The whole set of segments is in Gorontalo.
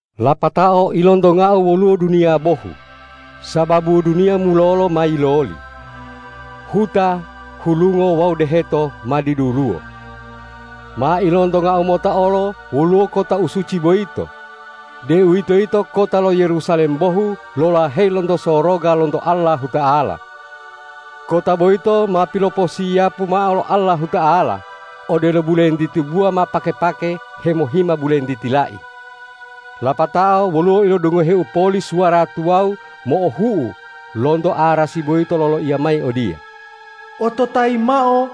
Lapatao ilontongau woluwo duniya bohu, sababu duniya mulolo ma yiloli. Huta, hulungo wawu deheto ma diduluwo. Ma ilontongau mota olo woluwo kota u suci boyito, deuwitoyito kota lo Yerusalem bohu lolaheyi lonto soroga lonto Allahuta'ala. Kota boyito ma piloposiyapu mao lo Allahuta'ala, odelo bulentiti buwa ma pake-pake hemohima bulentiti lai. Lapatao woluwo ilodungoheu poli suwara tuwawu mo'ohu'u lonto arasi boyito loloiya mayi odiye,”Ototayi mao: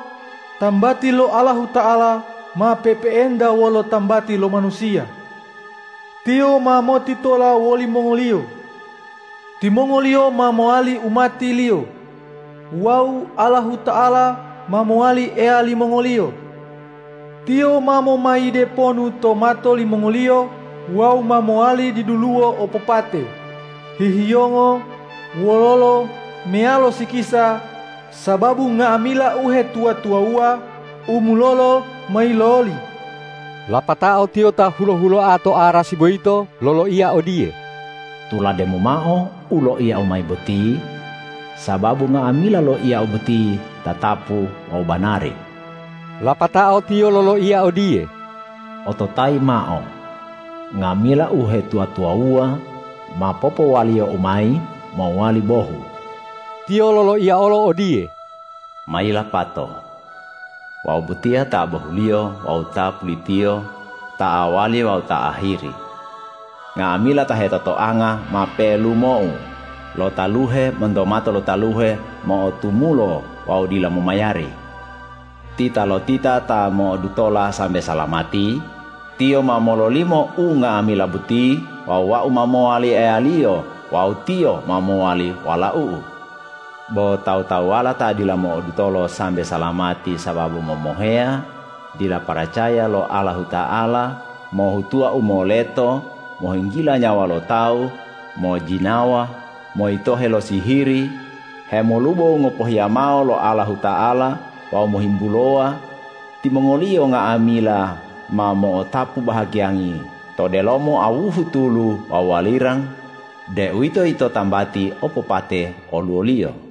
Tambati lo Allahuta'ala ma pe'epe'enta wolo tambati lo manusiya! Tiyo ma motitola wolimongoliyo. Timongoliyo ma mowali umati-Liyo wawu Allahuta'ala ma mowali Eya limongoliyo. Tiyo ma momayide ponu to mato limongoliyo wawu ma mowali diduluwo opopate, hihiyongo, wololo meyalo sikisa, sababu nga'amila uhetuwa-tuwawuwa u mulolo ma yiloli.” Lapatao Tiyo ta hulo-huloa to arasi boyito loloiya odiye,”Tulademu mao u loiya-U mayi boti, sababu nga'amila loiya-U boti tatapu wawu banari.” Lapatao Tiyo loloiya odiye,”Ototayi mao: Nga'amila uhetuwa-tuwawuwa ma popowaliyo-U mayi mowali bohu.” Tiyo loloiya olo odiye,”Ma yilapato! Wau botiya ta bohuliyo wawu ta pulitiyo, ta awwali wawu ta ahiri. Nga'amila ta hetotoanga ma pelumo-U lo taluhe monto mato lo taluhe mo'otumulo wawu dila momayari. Titalotita ta mo'odutola sambe salamati, tiyo ma mololimo unga'amila boti wawu Wau ma mowali Eyaliyo wawu tiyo ma mowali walau-U. Bo tawu-tawuwala ta dila mo'odutolo sambe salamati sababu momoheya, dila paracaya lo Allahuta'ala, mohhutuwa u moleto, mohinggila nyawa lo tawu, mojjinawa, moyitohe lo sihiri, hemolubo u ngopohiya mao lo Allahuta'ala wawu mohimbulowa, timongoliyo nga'amila ma mo'otapu bahagiyangi to delomo awuhu tulu wawu walirang, deuwitoyito tambati opopate oluwoliyo.”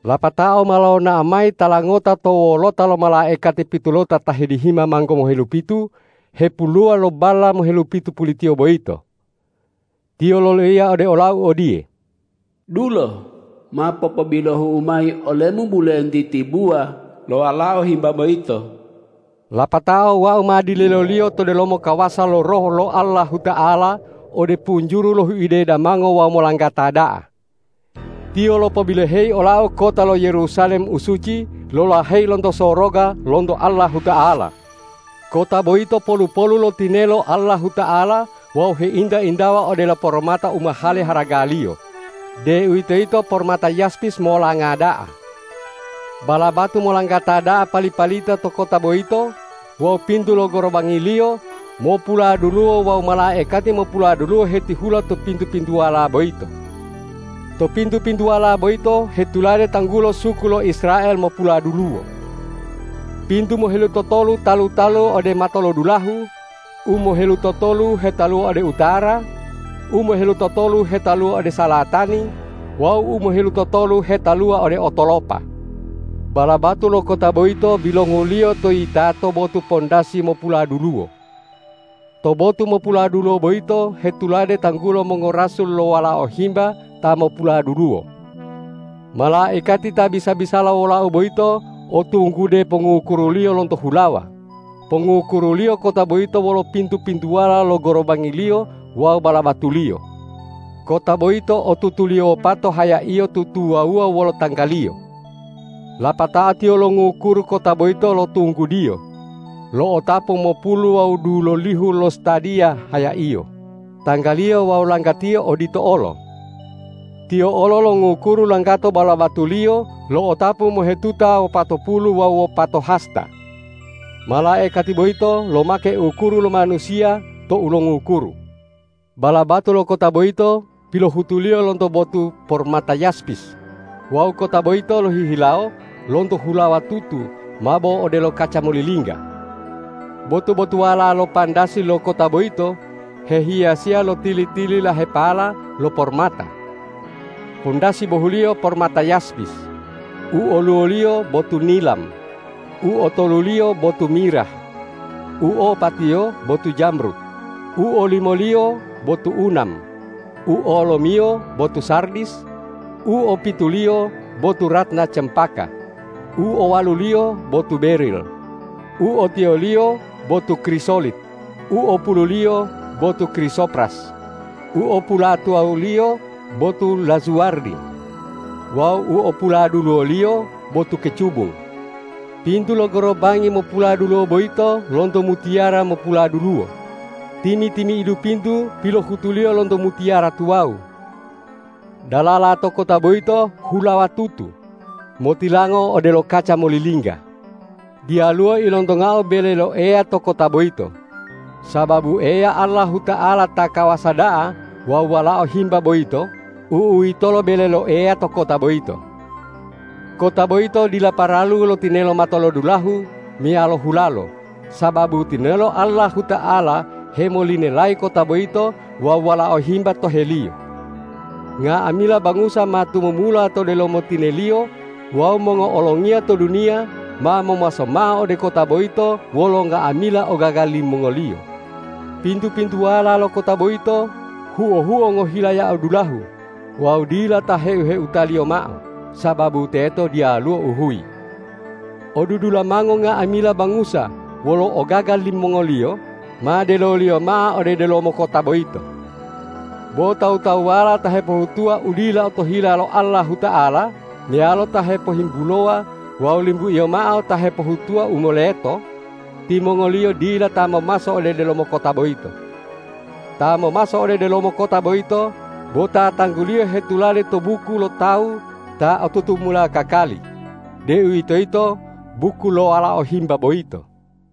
Lapatao ma lonao mayi tala ngota to wolota lo malaikati pitulota ta hedihima manggo mohelupitu hepoluwa lo balla mohelupitu pulitiyo boyito. Tiyo loloiya ode olau odiye,”Dulo, ma popobilohu'u mayi olemu bulentiti buwa lo Walao Himba boyito.” Lapatao wau ma dileloliyo to delomo kawasa lo Roh lo Allahuta'ala ode punjuru lo huide damango wawu molanggata da'a. Tiyo lopobiloheyi olau kota lo Yerusalem u suci lolaheyi lonto soroga lonto Allahuta'ala. Kota boyito polu-polu lo tinelo Allahuta'ala wawu heinta-intawa odelo pormata u mahale haragaliyo, deuwitoyito pormata yaspis molanga da'a. Balabatu molanggata da'a pali-palita to kota boyito wawu pintu lo gorobangiliyo mopuladuluwo wawu malaikati mopuladuluwo hetihula to pintu-pintuwala boyito. To pintu-pintuwala boyito hetulade tanggulo suku lo Israel mopuladuluwo. Pintu mohelutotolu talu-talu ode matolodulahu, u mohelutotolu hetaluwa ode utara, u mohelutotolu hetaluwa ode salatani wawu u mohelutotolu hetaluwa ode otolopa. Balabatu lo kota boyito bilonguliyo to yitato botu pandasi mopuladuluwo. To botu mopuladuluwo boyito hetulade tanggulo mongorasul lo Walao Himba ta mopuladuluwo. Malaikati ta bisa-bisala wolau boyito o tunggude pongngukuruliyo lonto hulawa, pongukuruliyo kota boyito wolo pintu-pintuwala lo gorobangiliyo wawu balabatuliyo. Kota boyito o tutuliyo wopato hayaiyo tutuwawuwa wolo tanggaliyo.Lapatao tiyo longukuru kota boyito lo tunggudiyo, lo'otapu mopulu wawu dulolihu lostadiya hayaiyo, tanggaliyo wawu langgatiyo odito olo. Tiyo olo longukuru langgato balabatuliyo lo'otapu mohetuta wopatopulu wawu wopato hasta. Malaikati boyito lomake ukuru lo manusiya tou longukuru. Balabatu lo kota boyito pilohutuliyo lonto botu pormata yaspis wawu kota boyito lohihilawo lonto hulawa tutu mabo odelo kaca molilingga. Botu-botuwala lo pandasi lo kota boyito hehiyasiya lo tili-tililahepala lo pormata. Pandasi bohuliyo pormata yaspis, u oluwoliyo botu nilam, u otoluliyo botu mirah, u opatiyo botu jamrud, u olimoliyo botu unam, u olomiyo botu sardis, u opituliyo botu ratna cempaka, u owaluliyo botu beril, u otiyoliyo botu krisolit, u opululiyo botu krisopras, u opulatuwawuliyo botu lazuwardi wawu u opuladuluwoliyo botu kecubung. Pintu lo gorobangi mopuladuluwo boyito lonto mutiyara mopuladuluwo, timi-timi'idu pintu pilohutuliyo lonto mutiyara tuwawu. Dalala to kota boyito hulawa tutu, motilango odelo kaca molilingga. Diyaluwo ilontongau bele lo Eya to kota boyito, sababu Eya Allahuta'ala ta kawasa da'a wawu Walao Himba boyito, u'uwitolo bele lo Eya to kota boyito. Kota boyito dila paralu lo tinelo matolodulahu meyalo hulalo, sababu tinelo Allahuta'ala hemolinelayi kota boyito wawu Walao Himba toheliyo. Nga'amila bangusa ma tumumula to delomo tineliyo wawu mongo'olongiya to duniya ma momaso mao ode kota boyito wolo nga'amila ogaga limongoliyo. Pintu-pintuwala lo kota boyito huo-huo ngohilayao dulahu wawu dila ta heu-heutaliyo mao, sababu teto diyaluwo uhuyi. Odudulamango nga'amila bangusa wolo ogaga limongoliyo ma deloliyo mao ode delomo kota boyito. Bo tawu-tawuwala ta hepohutuwa u dila otohila lo Allahuta'ala meyalo ta hepohimbulowa wawu limbuiyo mao ta hepohutuwa u moleto, timongoliyo dila ta momaso ode delomo kota boyito. Ta momaso ode delomo kota boyito bo ta tangguliyo hetulade to buku lo tawu ta o tutumula kakali, deuwitoyito buku lo Walao Himba boyito.